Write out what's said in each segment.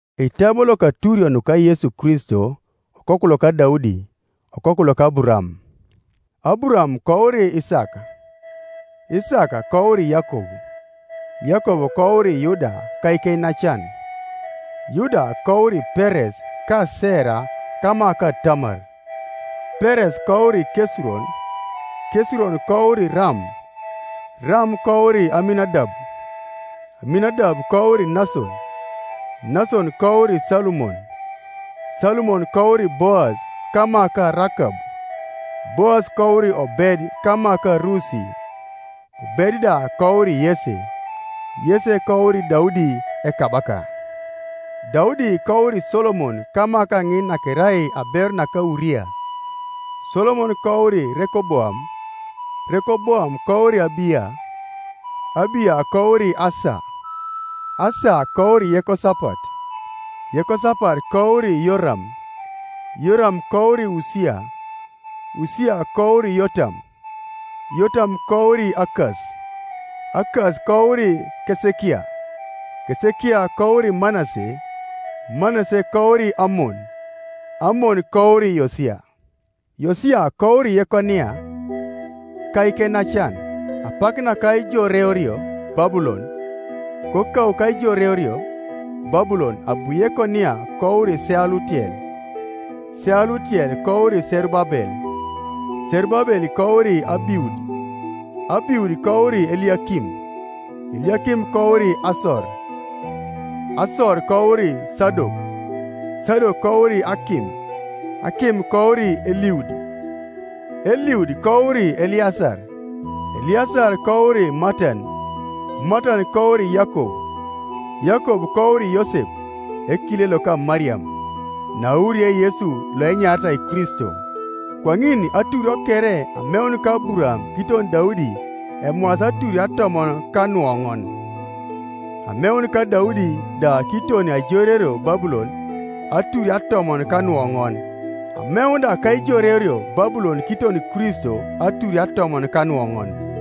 Eitabo loka aturio nuka Yesu Kristo, okoku loka Daudi, okoku loka Aburaam. Aburaam kouri Isaak, Isaak kouri Yakob, Yakob kouri Yuda ka ikeinacan; Yuda kouri Peres ka Sera kama ka Tamar; Peres kouri Kesuron; Kesuron kouri Ram; Ram kouri Aminadab; Aminadab kouri Nason; Nason kouri Salumon; Salumon kouri Boas kama ka Rakab; Boas kouri Obed kama ka Rusi; Obed da kouri Yese; Yese kouri Daudi ekabaka. Daudi kouri Solomon kama kaŋin nakerai aberu naka Uria; Solomon kouri Rekoboam; Rekoboam kouri Abiya; Abiya kouri Asa; Asa kouri Yekosapat; Yekosapat kouri Yoram; Yoram kouri Usia; Usia kouri Yotam; Yotam kouri Akas; Akas kouri Kesekia; Kesekia kouri Manase; Manase kouri Amon; Amon kouri Yosia; Yosia kouri Yekonia ka ikeinacan, apak naka aijoreorio Babulon. Kokau kaijoreorio Babulon abu Yekonia kouri Sealutiel; Sealutiel kouri Serubabel; Serubabel kouri Abiud; Abiud kouri Eliakim; Eliakim kouri Asor; Asor kouri Sadok; Sadok kouri Akim; Akim kouri Eliud; Eliud kouri Eleasar; Eleasar kouri Matan; Matan kouri Yakob; Yakob kouri Yosep ekile loka Mariam, naauriei Yesu loenyaritai Kristo. Kwaŋin aturio kere ameun ka Aburaam kiton Daudi emwaasi aturio atomon ka nuoŋon, ameun ka Daudi da kiton aijoreorio Babulon aturio atomon ka nuoŋon, ameun da kaijoreorio Babulon kiton Kristo aturio atomon ka nuoŋon.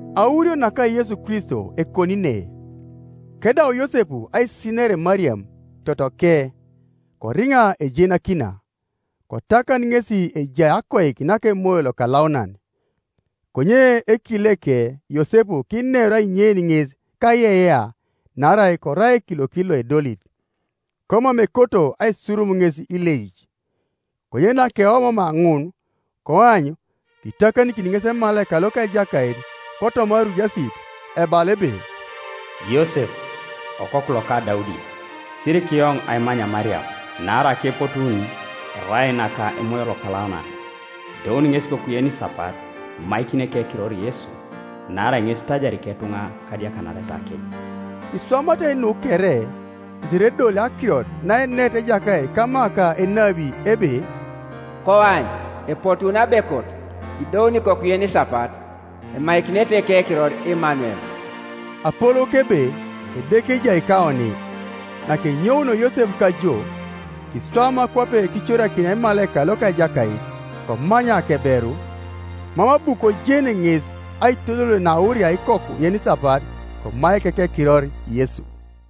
Aurio naka Yesu Kristo ekoni ne. Kedau Yosep aisiner Mariam totoke, koriŋa ejenakina, kotakan ŋesi ejai akoik naka Emoyo Lokalaunan. Konye ekileke Yosep kineru ainyein ŋes kaiyeiyea naarai korai ekiliokit loedolit, komam ekoto aisurum ŋes ileic. Konye nakeomoomaa ŋun, koany, kitakanikin ŋes emalaika loka Ejakait kotoma airujasit, ebala ebe, “Yosep, okoku loka Daudi, sirikiyoŋ aimany Mariam; naarai akepotuun erai naka Emoyo Lokalaunan. Idouni ŋesi ikoku yenisapat, imaikini ekekiror Yesu, naarai ŋes itajari iketuŋa kadiakanaretakec.” Iswamatai nu kere, tetere edoli akirot naenerit Ejakait kama ka enabi ebe: “Koany, epotuuni abekot, idouni ikoku yenisapat, Emaikinete ekekiror Imanuel” (apolouke ebe, Edeke ejai kaoni). Nakenyounio Yosep kajoo, kiswama kwape kicorakinia emalaika loka Ejakait, komany akeberu; mam abu kojen ŋes aitodol naauria ikoku yenisapat; komaik ekekiror Yesu.